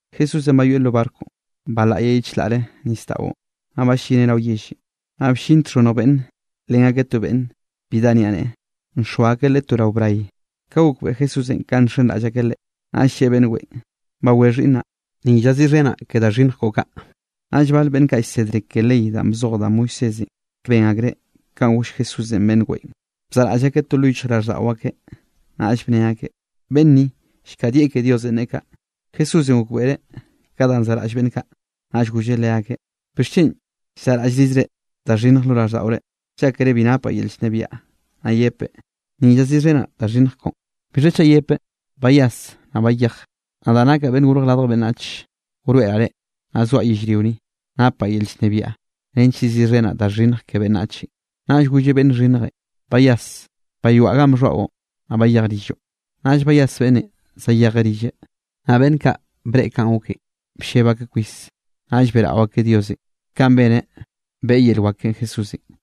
Jesúsenꞌ bayoeꞌ lo barconꞌ, balaꞌyeꞌ ye chlaꞌre nisdaꞌon, naꞌ ballineꞌ rao ralleꞌ. Naꞌ bllin txhonnj beꞌnn nlen akeꞌ to beꞌnn, bi dá niaꞌneꞌe, nxoa akeꞌ leꞌe to rao bray. Ka gokbeꞌe Jesúsenꞌ kanꞌ nxenraꞌll akeꞌ Leꞌe, naꞌll lleꞌe beꞌnn weꞌen: —Bawé xhiꞌnnaꞌ, ni llaziꞌxhenaꞌ ke da xhinnj koꞌo kaꞌ. Naꞌll bale beꞌnn kaꞌ llsedre ke ley danꞌ bzoj da Moisésenꞌ, ben akreꞌ kanꞌ goll Jesúsenꞌ beꞌnn weꞌen, bzaꞌraꞌll akeꞌ to lo yichjraꞌlldaꞌo akeꞌ, naꞌll bne akeꞌ: “Beꞌnn ni llkadieꞌ ke Diosenꞌ neꞌe kaꞌ.” Jesúsenꞌ gokbeꞌreꞌ ka danꞌ zaꞌraꞌll beꞌnn kaꞌ, naꞌll golleꞌ leakeꞌ: —¿Bixchen llzaꞌraꞌllrizre da xhinnj lo raꞌlldaꞌore? Llákere bi napaꞌ yel llnebiaꞌ naꞌ yepeꞌ: “Ni llaziꞌxhenaꞌ da xhinnj koꞌon.” ¿Bixha chaꞌ yepeꞌ: “Bayas naꞌ bayej”? Nadaꞌ nakaꞌ Beꞌnn Gorj Radj Beꞌnnach wroeꞌraꞌ reꞌ, naꞌ zoaꞌ yellrio ni, napaꞌ yel llnebiaꞌ nench yeziꞌxhenaꞌ da xhinnj ke beꞌnnachenꞌ. Naꞌll golleꞌ beꞌnn xhinnjenꞌ: —Bayas, bayoaꞌ ganꞌ bxhoaꞌo, naꞌ bayej rilloꞌ. Naꞌll bayas beꞌnnenꞌ zayejeꞌ rilleꞌ. Naꞌ beꞌnn kaꞌ breꞌe kanꞌ goken blleb akeꞌ kwis, naꞌll beꞌrao akeꞌ Diosenꞌ kanꞌ beneꞌ beꞌe yel wak keꞌen Jesúsenꞌ.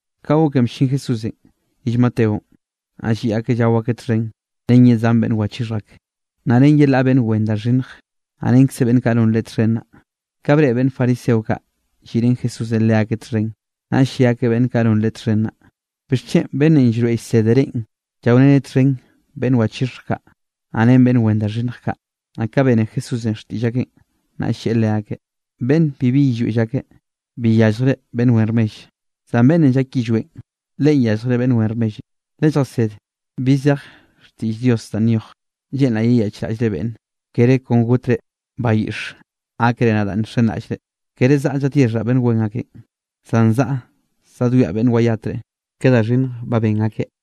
Ka goken bllin Jesúsenꞌ rill Mateonꞌ, naꞌ lliꞌ akeꞌ llao akeꞌ txhen ren ye zan beꞌnn wachixhj ak, naꞌ ren yelaꞌ beꞌnn wen da xhinnje, naꞌ renkze beꞌnn kaꞌ non Leꞌe txhen naꞌ. Ka breꞌe beꞌnn fariseo kaꞌ lliꞌ ren Jesúsenꞌ leakeꞌ txhen, naꞌll lle akeꞌ beꞌnn kaꞌ non Leꞌe txhen naꞌ: —¿Bixchen beꞌnnenꞌ llroeꞌ llsede reꞌn llaoreneꞌ txhen beꞌnn wachixhj kaꞌ, naꞌ ren beꞌnn wen da xhinnj kaꞌ? Naꞌ ka bene Jesúsenꞌ xtiꞌll akeꞌn, naꞌll lleꞌe leakeꞌ: —Beꞌnn bibi yillweꞌ llake, bi yalljreꞌ beꞌnn wen rmell, zan beꞌnnenꞌ llak yillweꞌn, leꞌen yalljreꞌ beꞌnn wen rmellenꞌ. Lelljased bi zej xtiꞌll Diosenꞌ danꞌ nyoj: “Lleꞌnraꞌ yeyaꞌchraꞌllre beꞌnne, kere kon gotre bayiꞌx gákere nadaꞌ nxenraꞌllre.” Kere zaꞌa zadyexhaꞌ beꞌnn wen akenꞌ, zan zaꞌa zadwiaꞌ beꞌnn wayatre ke da xhinnj ba ben akeꞌ.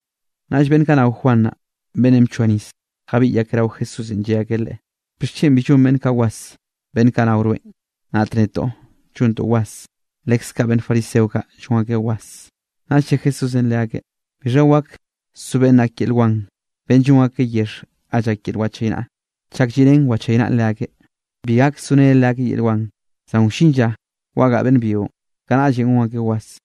Naꞌll beꞌnn kaꞌ nao Juan beꞌnnenꞌ bchoa nis, jabiꞌy akeꞌ rao Jesúsenꞌ, lle akeꞌ Leꞌe: —¿Bixchen bi llon beꞌnn kaꞌ was beꞌnn kaꞌ nao rweꞌn, naꞌt netoꞌ llontoꞌ was, leskaꞌ beꞌnn fariseo kaꞌ llon akeꞌ was? Naꞌll lle Jesúsenꞌ leakeꞌ: —¿Bixha wak so beꞌnn ak yel wan, beꞌnn llon akeꞌ yexh ga llak yel wachaynaꞌa chak lliꞌrén wachaynaꞌn leakeꞌ? Bi gak soreneꞌ leakeꞌ yel wan. Zan wllin lla wagaꞌa beꞌnn byionꞌ, kanaꞌllenꞌ gon akeꞌ was.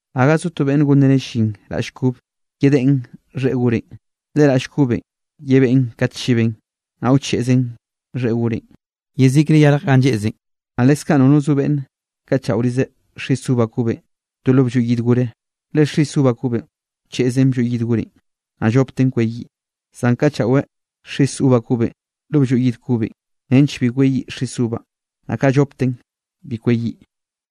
’Gaga zo beꞌnne gonreneꞌ llin raꞌll kobe, yedeꞌen xheꞌe gore, le raꞌll kobenꞌ, yebeꞌn kat chiben, naꞌ wcheꞌzen xheꞌe gorenꞌ, yezikre yarj ganꞌ nlleꞌzen. Naꞌ leskaꞌ nono zo beꞌnn kaꞌchaꞌorizeꞌ xis uva kobenꞌ to lo blloy yid gore, le xis uva kobenꞌ wcheꞌzen blloy yid gorenꞌ, naꞌ llopten kweyiꞌ. Zan kaꞌchaꞌweꞌ xis uva kobenꞌ lo blloy yid kobe, nench bi kweyiꞌ xis uvanꞌ, naꞌ kaꞌ llopten bi kweyiꞌ.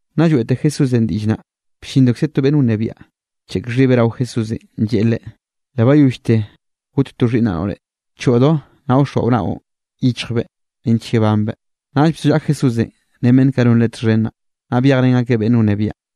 Nna lloeꞌte Jesúsenꞌ diꞌll naꞌ, bllindokze to beꞌnn wnebiaꞌ, bcheꞌk xhibeꞌ rao Jesúsenꞌ, lleꞌe Leꞌe: —Le bayollte got to xhiꞌnnaꞌ noꞌre. Choꞌdo naꞌ wxoa naoꞌn yichjbeꞌ nench yebanbeꞌ. Naꞌll bzollaꞌa Jesúsenꞌ ren beꞌnn kaꞌ non Leꞌe txhen naꞌ, naꞌ byejrén akeꞌ beꞌnn wnebiaꞌn.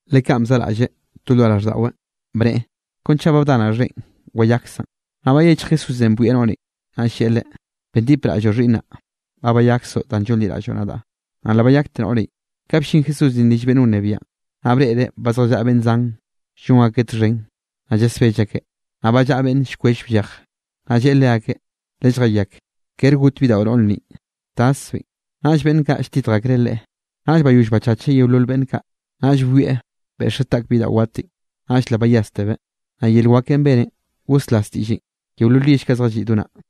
Le kanꞌ bzaꞌraꞌlleꞌ to lo raꞌlldaꞌweꞌ, bneꞌe: “Kon chaꞌ ba bdanaꞌ xheꞌen, wayaksaꞌn.” Naꞌ bayechj Jesúsenꞌ bwieꞌ noꞌrenꞌ, naꞌll lleꞌe leꞌe: —Bendipraꞌlloꞌ xhiꞌnnaꞌ. Ba bayaksoꞌ danꞌ llonliraꞌlloꞌ nadaꞌ. Naꞌ le bayakte noꞌrenꞌ. Ka bllin Jesúsenꞌ rill beꞌnn wnebiaꞌn, naꞌ breꞌreꞌ ba zjallaꞌa beꞌnn zan, llon akeꞌ txhen, naꞌ llasbell akeꞌ, naꞌ ba llaꞌa beꞌnn llkwell bllej. Naꞌll lleꞌe leakeꞌ: —Lelljayak. Kere got bidaꞌo noꞌr ninꞌ, taszbeꞌn. Naꞌll beꞌnn kaꞌ lltitj akreꞌ Leꞌe. Naꞌll bayoll bachacheꞌ yeolol beꞌnn kaꞌ, naꞌll byoeꞌ beꞌxeꞌ taꞌk bidaꞌo watenꞌ, naꞌll le bayástebeꞌ. Naꞌ yel wakenꞌ beneꞌn goslas diꞌllenꞌ yeolol yell kaꞌ zjalliꞌ do naꞌ.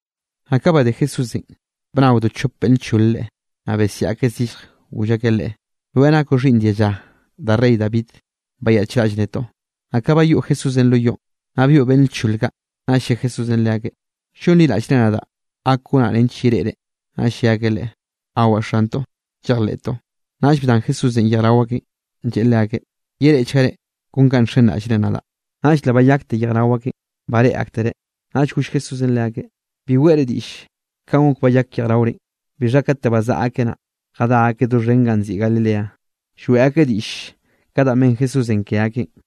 Naꞌ ka badé Jesúsenꞌ, bnaodo chop beꞌnn lchol Leꞌe, naꞌ besiaꞌ akeꞌ zillje, goll akeꞌ Leꞌe: —¡Rweꞌn nakoꞌ xhiꞌnn dialla da rey David, bayaꞌchraꞌll netoꞌ! Naꞌ ka bayoꞌ Jesúsenꞌ lo yoꞌn, naꞌ byoꞌ beꞌnn lchol kaꞌ, naꞌll lle Jesúsenꞌ leakeꞌ: —¿Llonliraꞌllre nadaꞌ gak gonaꞌ nench yereꞌre? Naꞌll lle akeꞌ Leꞌe: —Awaꞌ xantoꞌ, llejleꞌtoꞌ. Naꞌll bdan Jesúsenꞌ yej rao akeꞌn, lleꞌe leakeꞌ: —Yereꞌchgare kon kanꞌ nxenraꞌllre nadaꞌ. Naꞌll le bayakte yej rao akeꞌn, bareꞌe aktereꞌ. Naꞌll goll Jesúsenꞌ leakeꞌ: —Bi weꞌre diꞌll kanꞌ gok bayak yejraorenꞌ. Bixha kate bazaꞌa akeꞌ naꞌ, jadá akeꞌ doxhen ganꞌ nziꞌi Galilea, lloeꞌ akeꞌ diꞌll ka danꞌ ben Jesúsenꞌ ke akeꞌn.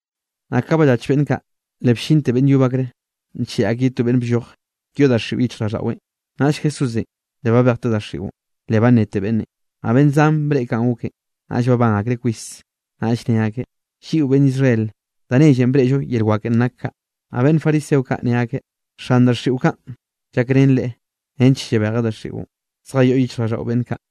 Naꞌ ka ballach beꞌnn kaꞌ, le bllinte beꞌnn yob akreꞌ, ncheꞌe akeꞌ ye to beꞌnn blloje yoꞌ daxiꞌo yichjraꞌlldaꞌweꞌn. Naꞌll Jesúsenꞌ le babejteꞌ daxiꞌon, le bannete beꞌnnenꞌ. Naꞌ beꞌnn zan breꞌe kanꞌ goken, naꞌll babán akreꞌ kwis, naꞌll ne akeꞌ: —Lliꞌo beꞌnn Israel, da nellenꞌ breꞌllo yel wakenꞌ nak kaꞌ. Naꞌ beꞌnn fariseo kaꞌ ne akeꞌ: —Xan daxiꞌo kaꞌn llakrenen leꞌe, nench llabejeꞌ daxiꞌon zjayoꞌ yichjraꞌlldaꞌo beꞌnn kaꞌ.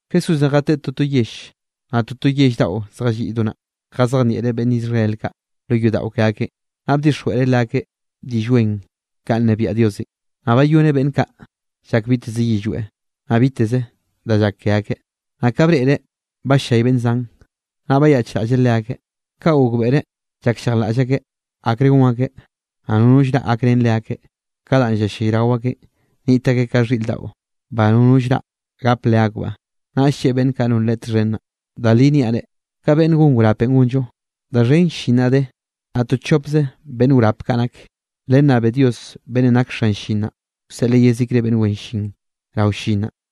Jesúsenꞌ jateꞌe toto yell, naꞌ toto yell daꞌo zjalliꞌ do naꞌ, jazejnieꞌreꞌ beꞌnn Israel kaꞌ lo yodaꞌo ke akeꞌn, naꞌ bdixjweꞌreꞌ leakeꞌ Diꞌll Wen kanꞌ nnebiaꞌ Diosenꞌ, naꞌ bayoneꞌ beꞌnn kaꞌ llak biteze yillweꞌ, naꞌ biteze da llak ke akeꞌ. Naꞌ ka breꞌreꞌ ba bllay beꞌnn zan, naꞌ bayaꞌchraꞌlleꞌ leakeꞌ. Ka gokbeꞌreꞌ llakllejlaꞌll akeꞌ, akre gon akeꞌ, naꞌ nono llraꞌ gakrén leakeꞌ ka danꞌ llallayrao akeꞌn. Niꞌt akeꞌ ka xhiꞌr daꞌo, ba nono llraꞌ gap leakbaꞌ. Naꞌll lleꞌe beꞌnn kaꞌ non Leꞌe txhen naꞌ: —Da li niaꞌ reꞌ, ka beꞌnn gon wrapenꞌ gonllo, da xhen llin naꞌ de, naꞌ to chopze beꞌnn wrap kaꞌ nak. Lennabe Dios beꞌnnenꞌ nak xan llin naꞌ, wseꞌleꞌ yezikre beꞌnn wen llin rao llin naꞌ.